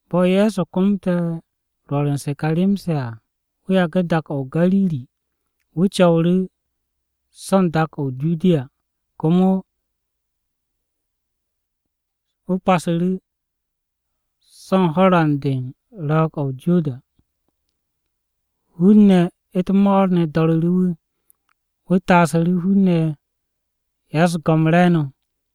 Bo̱ Ye̱so komte̱ rwo̱r u̱n se̱ ká rem-se à, wu̱ yagu̱ dak-o̱ o-Gariri. Wu̱ co̱wu̱ru̱ so̱ u̱n dak-o̱ o-Judiya, komo wu̱ pasu̱ru̱ so̱ u̱n ho̱ran-de u̱n Ro̱o̱g-o̱ o-Joda à. Hun-ne̱ u̱t-mo̱o̱r ne̱ do̱ru̱ru̱ wu̱, wu̱ taasu̱ru̱ hun-ne̱ ya-u̱s-go̱m re̱e̱no̱.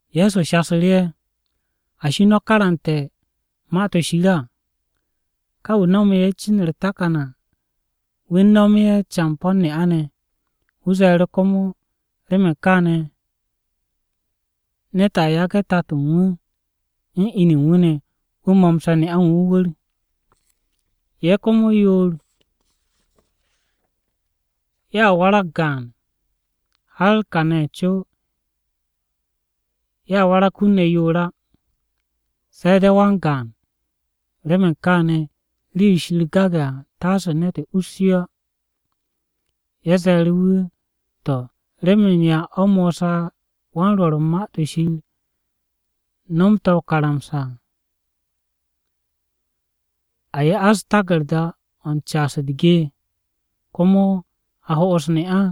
Ye̱so shasu̱ru̱ ye̱, “¿Ashi, no̱ karante̱ Ma-to̱ Shir á? Ka wu̱ no̱mu̱ ye̱ cin u̱r-takan à, ‘Wu̱ u̱n no̱m ye̱ campo̱ u̱n ne'a ne̱.’ Wu̱ ze̱e̱ru̱ komo, ‘Remen kaane̱, ne̱t a yage̱ tato u̱n wu̱ u̱n inu u̱n wu̱ ne̱, wu̱ mo̱mse̱ ne'a u̱n wu̱ o-wu̱r. Ye̱ komo yoor, ye̱a warag gaan.’ Har kane̱ co ye̱a warag hun-ne̱ yoor á, se̱ de̱ wan-gaan. Remen kaane̱, rii-yo Shir gage̱ à, taase ne̱t us yo á.” Ye̱ ze̱e̱ru̱ wu̱, “To̱, ¿remen yan o̱ Mosawan-Rwo̱r u̱n Ma-to̱ Shir nomte̱ o-karamsa a ya'as taku̱rda-o̱ u̱n caas u̱t-ge, komo a ho'os ne'a?”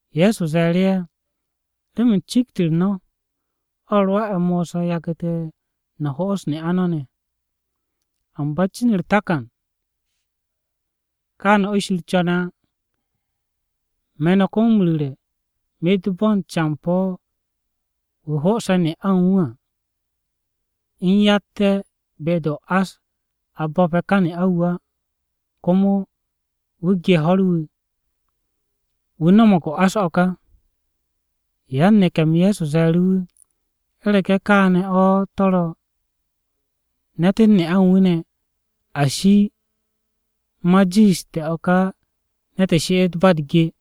Ye̱so ze̱e̱ru̱ ye̱, “Remen cikt-u̱r no̱, o̱ rwo̱'e̱ Mosa yagu̱te̱ no̱ ho'os ne'a no̱ ne̱, amba cin u̱r-takan káane̱ o̱ Shir co̱ne̱ á. Me̱ no̱ komo m-ru̱re̱, myet bo̱ u̱n campo̱ wu̱ ho'ose̱ ne'a u̱n wu̱ à, u̱n yatte̱ be-de o-ás a bo̱pe̱ ká ne'a-wu̱ á, komo wu̱ ge ho̱r-wu̱, wu̱ no̱mo̱g o-ás o̱ ka.” Yan-neke̱-m Ye̱so ze̱e̱ru̱ wu̱, “U̱rege̱ kaane̱ o̱ to̱ ro̱, ne̱t u̱n ne'a u̱n wu̱ ne̱, ashi ma jiishte̱ o̱ ka ne̱t she'et ba u̱t-ge.”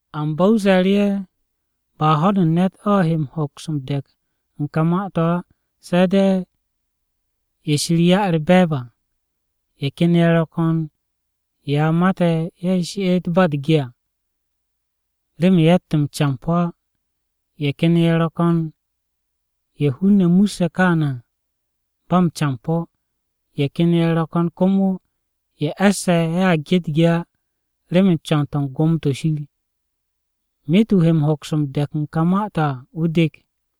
Amba wu̱ ze̱e̱ru̱ ye̱, “Ba ho̱n u̱n ne̱t o̱ he m-hoks m-de̱k u̱n ka ma-to̱ á se̱ de̱ ye̱ Shir ya'e̱ u̱r-be̱e̱b à. Ye̱ ken ye̱ ro̱ ko̱n ye̱ a mate̱ ye̱ she'et ba u̱t-ge à, remen ye̱tt m-campo̱ á. Ye̱ ken ye̱ ro̱ ko̱n ye̱ hun-ne̱ musse̱ kaane̱ à, ba m-campo̱. Ye̱ ken ye̱ ro̱ ko̱n komo ye̱ e̱sse̱ ye̱a ge u̱t-ge á, remen co̱n-to̱ u̱n Gwo̱mo-to̱ Shir. Myet wu̱ he m-hoks m-de̱k u̱n ka ma-to̱ à wu̱ dek.”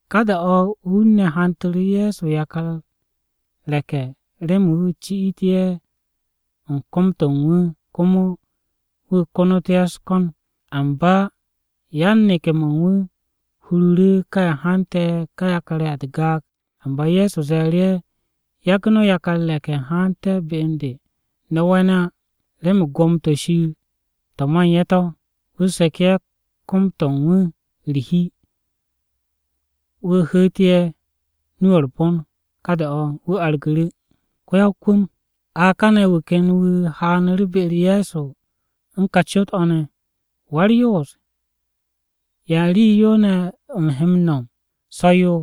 Ka da-o̱ hun-ne̱ hantu̱ru̱ Ye̱so yakar re̱k-ye̱ remen wu̱ cit ye̱ u̱n kom-to̱ u̱n wu̱ komo wu̱ konoté̱ ye̱ u̱s-ko̱n. Amba yan-neke̱-mo̱ u̱n wu̱ huru̱ru̱ ká ye̱ hante̱ ká yakar-ye̱ à u̱t-gaag. Amba Ye̱so ze̱e̱ru̱ ye̱, “Yagu̱ no̱ yakar re̱k-ye̱ haante̱ be u̱n de. No̱ we̱n ye̱ á. Remen gwo̱mo-to̱ Shir to̱ ma u̱n ye̱ to̱.” Wu̱ seke̱ ye̱ kom-to̱ u̱n wu̱ u̱r-hi, wu̱ hu̱u̱te̱ ye̱ nu-o̱ u̱r-bon. Ká da-o̱ wu̱ argu̱ru̱. A kane̱ wu̱ ken wu̱ haaru̱ be-u̱r Ye̱so u̱n kà cot-o̱ ne̱, “Wa-u̱r-Yoos, ¿yan rii-yo ne̱ u̱m he m-no̱m so̱-yo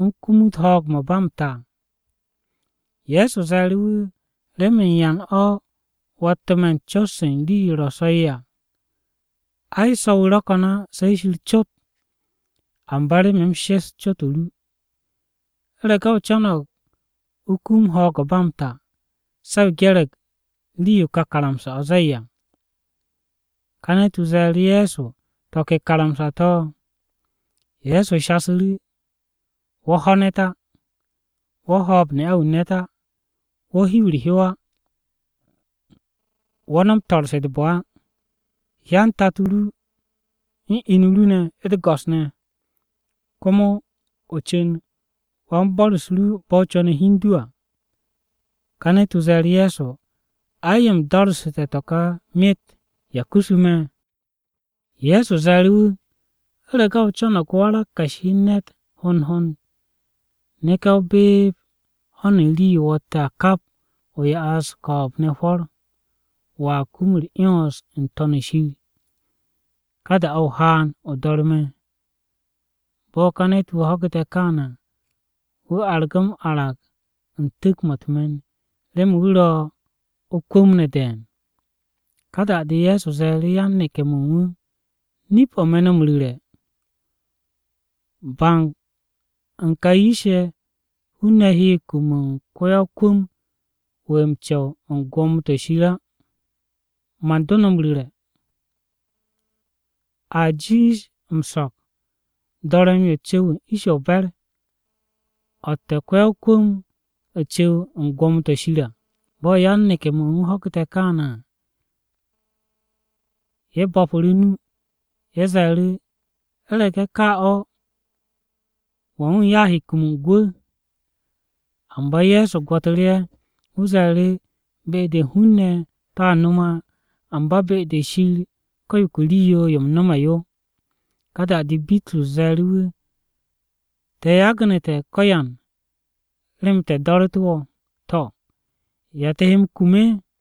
u̱m kumut ho̱o̱g-mo̱ ba m-ta à?” Ye̱so ze̱e̱ru̱ wu̱, “¿Remen yan o̱ wo̱ttu̱ me̱ u̱n cot-se u̱n rii-yo ro̱ so̱-yo à? Ai, so̱-wu̱ ro̱ ko̱n á se̱ Shir cot. Amba remen u̱m shest wo̱ cot-o ru, u̱rege̱ o co̱no̱g o kum ho̱o̱g-o̱ ba m-ta, se̱ o gye̱re̱g rii-yo ká karamsa-o̱ zee à.” Ká ne̱t-wu̱ ze̱e̱ru̱ Ye̱so, “¿To̱ ke karamsa-to̱?” Ye̱so shasu̱ru̱, “Wo̱ ho̱ ne̱t á, wo̱ hoob ne'a-wu̱ u̱n ne̱t á, Wo̱ hiw u̱r-hyow á. Wo̱ no̱m to̱r-se u̱t-bo̱ á. Hyan tato ru u̱n inu ru ne̱ u̱t-go̱s ne̱. Komo o cu̱n wan-bo̱r-u̱s ru bo̱ o co̱ne̱ hi u̱n du à.” Ká ne̱t-wu̱ ze̱e̱ru̱ Ye̱so, “Ai, u̱m do̱ru̱ssu̱te̱ to̱ ká myet, ¿ya kusu me̱?” Ye̱so ze̱e̱ru̱ wu̱, “U̱rege̱ o co̱no̱g o warag kashi u̱n ne̱t hond hond, neke̱ o beeb ho̱no u̱n rii-yo wo̱tte̱ à kap, o ya'as ko̱o̱b-ne̱ hwo̱r, wo̱a kum u̱r-'yons n-To̱n shir. Ka da-o̱ o haan, o do̱ru̱ me̱.” Bo̱ ká ne̱t-wu̱ ho̱gu̱te̱ kaane̱ à, wu̱ argu̱ m-arag u̱n tu̱k-mo̱ u̱t-me̱n, remen wu̱ ro̱ o-kwu̱m ne̱ de̱e̱n. Ka da-de, Ye̱so ze̱e̱ru̱ yan-neke̱-mo̱ u̱n wu̱, “Nip-o̱ me̱ no̱ m-ru̱re̱, ba u̱n ka yish-ye̱ hun-ne̱ he kum u̱n ko-ya-o-kwu̱m-wu̱ he m-co̱w u̱n gwo̱mo-to̱ Shir n-To̱n à. Man do no̱ m-ru̱re̱. A jiish m-so̱k dorom-yo cu̱w u̱n ish-o̱ o-be̱r, o̱tte̱ ko-ya-o-kwu̱m cu̱w u̱n gwo̱mo-to̱ Shir à.” Bo̱ yan-neke̱-mo̱ u̱n wu̱ ho̱gu̱te̱ káane̱ à, ye̱ bo̱pu̱ru̱ o-nu. Ye̱ ze̱e̱ru̱, “U̱rege̱ káá o̱, ¿wan wu̱ u̱n ya he kum u̱n gwu̱?” Amba Ye̱so gwo̱tu̱ru̱ ye̱, wu̱ ze̱e̱ru̱, “Be-de u̱n hun-ne̱, to̱a nome̱ á. Amba be-de Shir ko̱ yo ke rii-yo yo m-nome̱ yo.” Ka da-de Bitrus ze̱e̱ru̱ wu̱, “Te̱ yagu̱te̱ ko̱yan remen te̱ do̱ru̱tú̱ wo̱. To̱, ¿ya te̱ he m-kum?”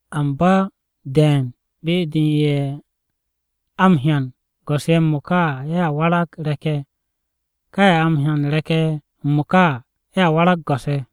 Amba de̱e̱n be-de u̱n ye̱ a m-hyan go̱s-ye̱ m-mo̱ka à ye̱a warag re̱k-ye̱. Ka ye̱ a m-hyan re̱k-ye̱ m-mo̱ka à, ye̱a warag go̱s-ye̱.